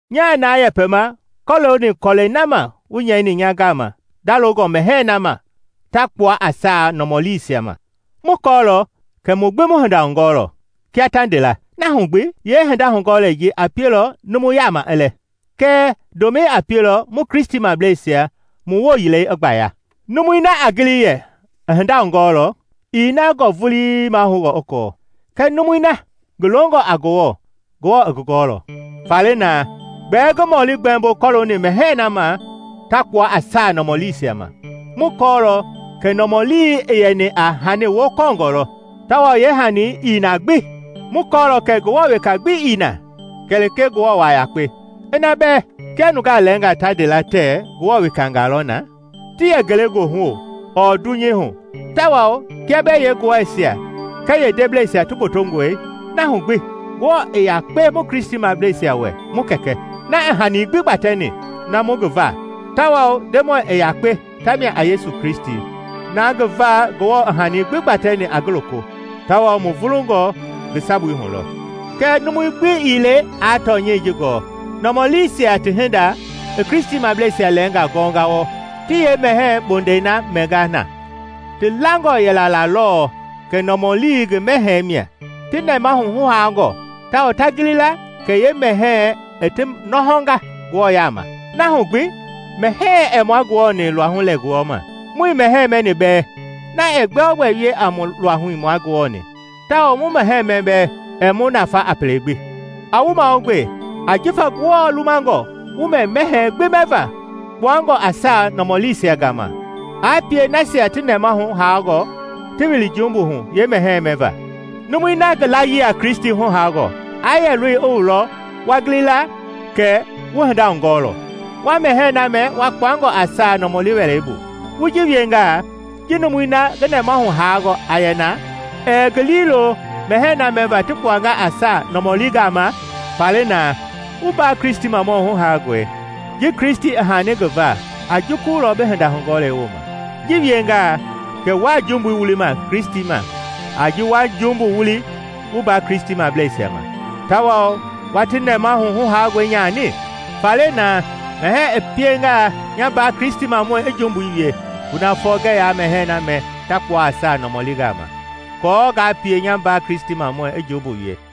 Nyaa na yɛpɛma kɔlooni kɔlɛi na ma wu nyɛini nya gama ndalongɔ mɛhɛɛ na ma ta kpua a saa nɔmɔliisia ma. Mu kɔɔlɔ kɛ mu gbi mu hinda hugɔɔlɔ, kia ta nde la. Na hu gbi, yeehinda hugɔɔlei ji a pielɔ numu yaama i lɛ; kɛɛ ndomɛi a pielɔ mu Kristimableisia mu wooyilɛi i gbaya. Numui na a gili yɛ i hinda hugɔɔlɔ, ii na gɔɔ vulii mahoungɔ i kɔɔ. Kɛɛ numui na ngi longɔ a Ngewɔ, Ngewɔ i ngi gɔɔlɔ. Faale naa, gbɛɛ ngi mɔli gbɛmbo kɔlooni mɛhɛɛ na ma ta kpua a saa nɔmɔliisia ma, mu kɔɔlɔ kɛ nɔmɔlii i yɛni a hani wokɔɔngɔ lɔ, tawao yeehani ii na gbi; mu kɔɔlɔ kɛ Ngewɔ weka gbi ii na kɛlee Ngewɔ waa yakpe. Ina bɛɛ, kia nungaa lɛɛngaa ta nde la, Ngewɔ wekangaa lɔ na, ti yɛ ngelegoohu ɔɔ dunyei hu, tawao kia bɛɛ yee ngewɔɛisia kɛɛ yeendeblɛisia ti gbotongɔe, na hu gbi Ngewɔ i yakpe mu Kristimableisia wɛ, mu Kɛkɛ, na i hani gbi gbatɛni, na mu ngi va; tawao Ndemɔi i yakpe tamia a Yesu Kristi, na ngi va Ngewɔ i hani gbi gbatɛni a ngi loko, tawao mu vulungɔ ngi sabui hu lɔ. Kɛɛ numui gbi ii le aa tɔnyɛi ji gɔɔ. Nɔmɔliisia ti hinda i Kristimableisia lɛɛngaa gɔnga wa wɔɔ, ti yeemɛhɛɛ bondɛi na mɛnga na, ti langɔ yɛla la lɛ lɔɔ kɛ nɔmɔlii ngi mɛhɛɛ mia; ti nɛmahu huhaangɔ tawao ta gili la kɛ yeemɛhɛɛ i ti nɔhɔnga Ngewɔ yaama. Na hu gbi mɛhɛɛ ɛɛ mua Ngewɔ-ni mu luahui lɛ gulɔma; muii mɛhɛɛ mɛni bɛɛ, na ɛɛ gbɛogbɛ wie a mu luahui mua Ngewɔ-ni, tawao mu mɛhɛɛ mɛ bɛɛ, ɛɛ mu nafa a pele gbi. A wu mahugbe, ajifa Ngewɔ lumangɔ wu mɛ mɛhɛɛ gbi mɛva kpaungɔ a saa nɔmɔliisia gama aa pie nasia ti nɛmahu huhaangɔ ti wili jumbu hu yee mɛhɛɛ mɛva. Numui na ngi layii a Kristi huhaangɔ aa yɛ loi i wu lɔ wua wu gilingɔ la wu hinda hugɔɔlɔ, wa mɛhɛɛ na mɛ kpuangɔ a saa nɔmɔli wɛlei bu, wu ji wiengaa ji numu na ngi nɛmahu haanga a yɛna ɛɛ ngi liilo mɛhɛɛ na mɛva ti kpuanga a saa nɔmɔlingaa ma? Faale na, wu mbaa Kristimɔ huhaangɔi ji Kristi i haani ngi va a jukulɔ bi hinda hugɔɔlei wooma. Ji wiengaa kɛ wuaa jumbui wulima Kristi ma a ji wa jumbu wuli wu mbaa Kristimableisia ma, tawao wa ti nɛmahu huhaangɔi nyani. Faale naa, mɛhɛɛ i piengaa nya mbaa Kristimamɔi i jumbu wie, kunafɔ ngɛɛ yaa mɛhɛɛ na mɛ ta kpua a saa nɔmɔlingaa ma, aako ngaa pie nya mbaa Kristimamɔi i jumbu wie.